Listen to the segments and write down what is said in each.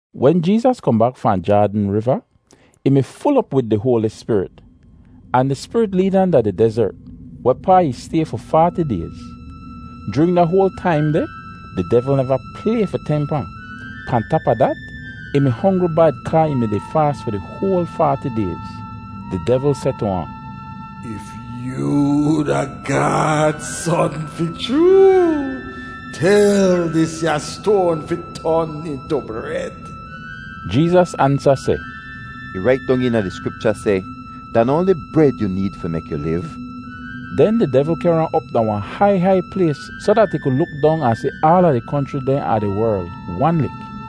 Wen Jeezas kohn bak fahn Jaadn Riva, ih mi ful op wid di Hoali Spirit. Ahn di Spirit leed ahn da di dezert, wehpaa ih stay fi faati dayz. Joorin da hoal taim deh di devl neva play fi temp ahn. Pahn tap a dat, ih mi hongri bad kaa ih mi-di faas fi di hoal faati dayz. Di devl seh tu ahn, “If yoo da Gaad Son fi chroo, tel disya stoan fi ton intu bred.” Jeezas ansa seh, “Ih rait dong eena di Skripcha seh, ‘Da noh oanli bred yu need fi mek yu liv.’” Den di devl kehr ahn op da wahn hai hai plays soh dat ih ku luk dong ahn si aala di konchri dehn a di werl, wan lik.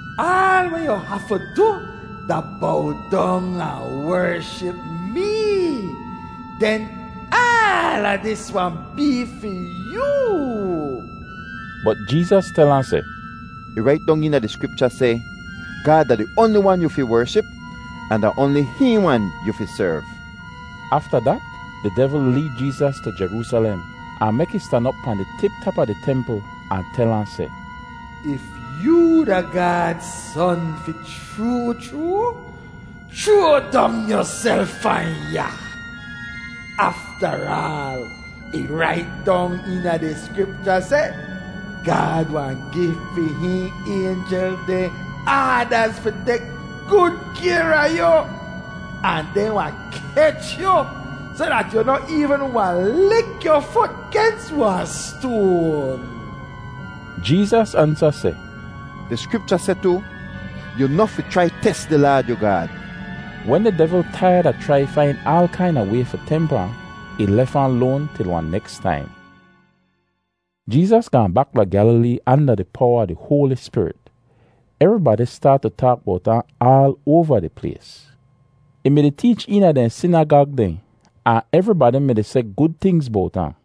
Aal weh yu hafu du da bow dong ahn wership mee, den aala dis wahn bee fi yoo.” Bot Jeezas tel ahn seh, “Ih rait dong eena di Skripcha seh, ‘Gaad da di oanli wan yu fi wership, ahn da oanli hihn wan yu fi serv.’” Afta dat di devl leed Jeezas tu Jeroosalem, ahn mek ih stan op pahn di tip tap a di templ ahn tel ahn seh, “If yoo da Gaad Son fi chroo chroo, chroa dong yuself fahn ya. Aftaraal, ih rait dong eena di Skripcha seh, ‘Gaad wahn gi fi hihn aynjel dehn aadaz fi tek gud kayr a yu, ahn dehn wahn kech yu soh dat yu noh eevn wahn lik yu fut gens wahn stoan.’” Jeezas ansa seh, “Di Skripcha seh tu, ‘Yu noh fi chrai tes di Laad yu Gaad.’” Wen di devl taiyad a chrai fain aal kaina way fi temp ahn, ih lef ahn loan til wahn neks taim. Jeezas gaahn bak da Gyalilee anda di powa a di Hoali Spirit. Evribadi staat tu taak bowt ahn aal oava di plays. Ih mi-di teech eena dehn sinagag dehn, ahn evribadi mi-di seh gud tingz bowt ahn.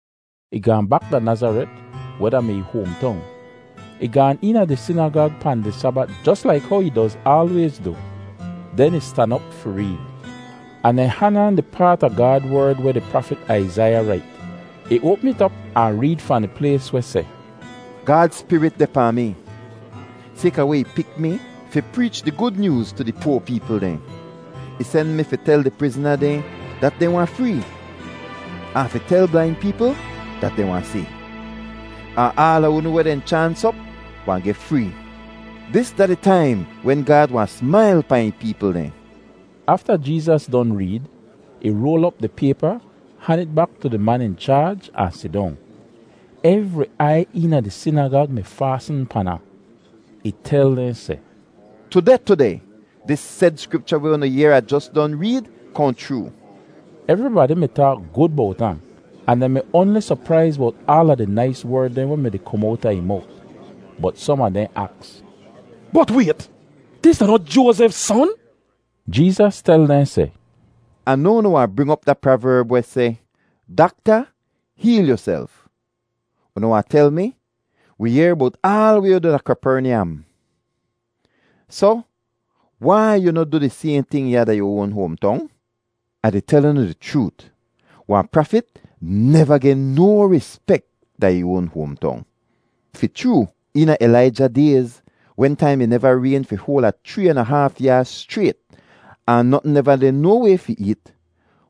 Ih gaahn bak da Nazaret, weh da-mi ih hoamtong. Ih gaan eena di sinagag pahn di Sabat jos laik how ih doz aalwayz du. Den ih stan op fi reed, ahn dehn han ahn di paat a Gaad Werd weh di prafit Aizaiya rait. Ih oapm it op ahn reed fahn di plays weh seh, “Gaad Spirit deh pahn mi, sayka weh ih pik mi fi preech di Gud Nyooz tu di poa peepl dehn. Ih sen mi fi tel di prizna dehn dat dehn wahn free, ahn fi tel blain peepl dat dehn wahn si. Ahn aala unu weh dehn chaans op wahn geh free. Dis da di taim wen Gaad wahn smail pahn ih peepl dehn.” Afta Jeezas don reed, ih roal op di paypa, han it bak tu di man in chaaj, ahn sidong. Evri aiy eena di sinagag mi faasn pan ahn. Ih tel dehn seh, “Tudeh tudeh, dis sed Skripcha weh unu yehr Ah jos don reed kohn chroo.” Evribadi mi taak gud bowt ahn, ahn dehn mi oanli sopraiz bowt aala di nais werd dehn weh mi-di kom owta ih mowt. Bot som a dehn aks, “Bot wayt! Dis da noh Joazef son?” Jeezas tel dehn seh, “Ah noa unu wahn bring op da praverb weh seh, ‘Dakta, heel yuself.’ Unu wahn tel mi, ‘Wi yehr bowt aal weh yu du da Kapernyam. Soh wai yu noh du di sayhn ting ya da yu oan hoamtong?’” “Ah di tel unu di chroot, wahn prafit neva geh no rispek da ih oan hoamtong! Fi chroo, eena Ilaija dayz, wentaim ih neva rayn fi hoal a chree an a haaf yaaz schrayt ahn notn neva deh no way fi eet,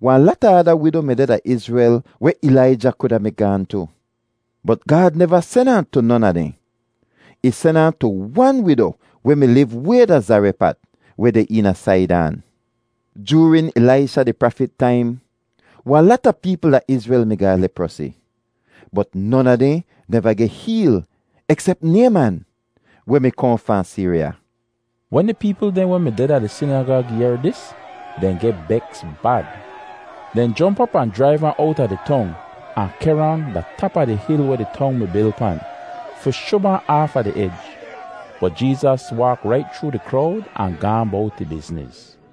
wahn lata ada wido mi deh da Izrel weh Ilaija kuda mi gaahn tu. Bot Gaad neva sen ahn tu non a dehn. Ih sen ahn tu wan wido weh mi liv way da Zarepat weh deh eena Saidan! Joorin Ilaisha di prafit taim, wahn lata peepl da Izrel mi ga leprosi. Bot non a dehn neva geh heel eksep Nayman, weh mi kohn fahn Siriya.” Wen di peepl dehn weh mi deh da di sinagag yehr dis, dehn geh beks bad! Dehn jomp op ahn jraiv ahn owta di tong, ahn kehr ahn da tap a di hil weh di tong mi bil pan, fi shub ahn aafa di ej. Bot Jeezas waak rait chroo di krowd ahn gaahn bowt ih bizniz.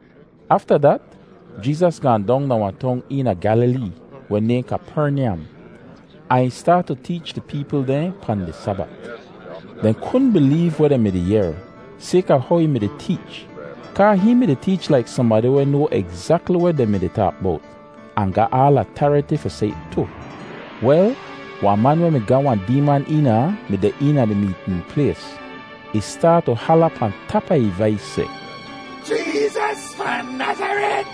Afta dat Jeezas gaahn dong da wahn tong eena Gyalilee weh nayhn Kapernyam, ahn ih staat tu teech di peepl dehn pahn di Sabat. Dehn kudn bileev weh dehn mi-di yehr, sayka how ih mi-di teech, kaa hihn mi-di teech laik sohnbadi weh noa egzakli weh dehn mi-di taak bowt, ahn ga aal atariti fi seh it tu. Wel, wahn man weh mi ga wahn deeman eena ahn mi deh eena di meetn plays. Ih staat tu hala pahn tap a ih vais seh, “Jeezas fahn Nazaret,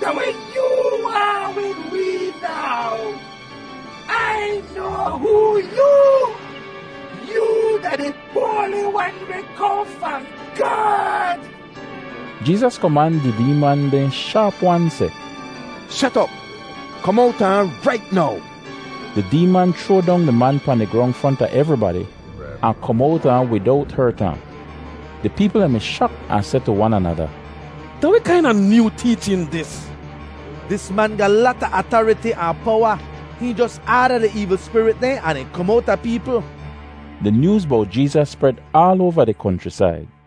da weh yoo waahn wid wee now? Ai noa hoo yoo! Yoo da di Hoali Wan weh kohn fahn Gaad!” Jeezas koman di deeman dehn shaap-wan seh, “Shet op! Kom owta ahn rait now!” Di deeman chroa dong di man pahn di grong fronta evribadi, ahn kom owta ahn widowt hert ahn. Di peepl dehn mi shak ahn seh tu wan anada, “Da weh kaina nyoo teechin dis? Dis man ga lata atariti ahn powa! Hihn jos aada di eevl spirit dehn, ahn dehn kom owta peepl!” Di nyooz bowt Jeezas spred aal oava di konchrisaid.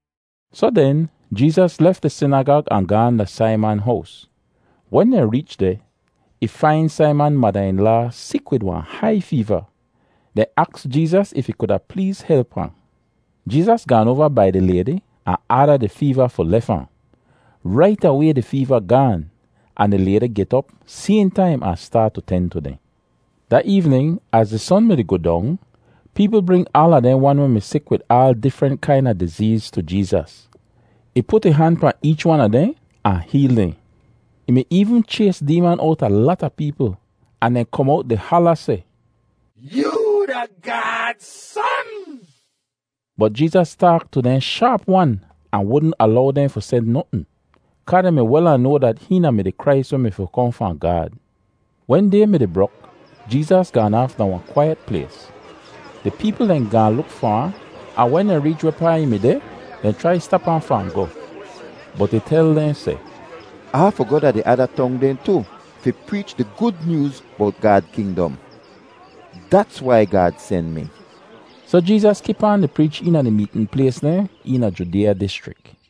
Soh den, Jeezas lef di sinagag ahn gaahn da Saiman hows. Wen dehn reech deh, ih fain Saiman mada-in-laa sik wid wahn hai feeva. Dehn aks Jeezas if ih kuda pleez help ahn. Jeezas gaan oava bai di laydi ahn aada di feeva fi lef ahn. Rait away di feeva gaan, ahn di laydi get op sayhn taim ahn staat tu ten tu dehn. Da eevnin, az di son mi-di goh dong, peepl bring aala dehn wan weh mi sik wid aal difrent kaina dizeez tu Jeezas. Ih put ih han pahn eech wan a dehn ahn heel dehn. Ih mi eevn chays deeman owta lata peepl, ahn dehn kom owt di hala seh, “Yoo da Gaad Son!” Bot Jeezas taak tu dehn shaap-wan ahn wudn alow dehn fi seh notn kaa dehn mi wel ahn noa dat hihn da-mi di Krais weh mi fi kohn fahn Gaad. Wen day mi-di brok, Jeezas gaan aaf da wahn kwaiyet plays. Di peepl dehn gaahn luk far ahn, ahn wen dehn reech wehpaa ih mi deh, dehn chrai stap ahn fahn goh. Bot ih tel dehn seh, “Ah hafu goh da di ada tong dehn tu fi preech di Gud Nyooz bowt Gaad kingdom. Dats wai Gaad sen mi.” Soh Jeezas kip aan di preech eena di meetn plays dehn eena Judeeya dischrik.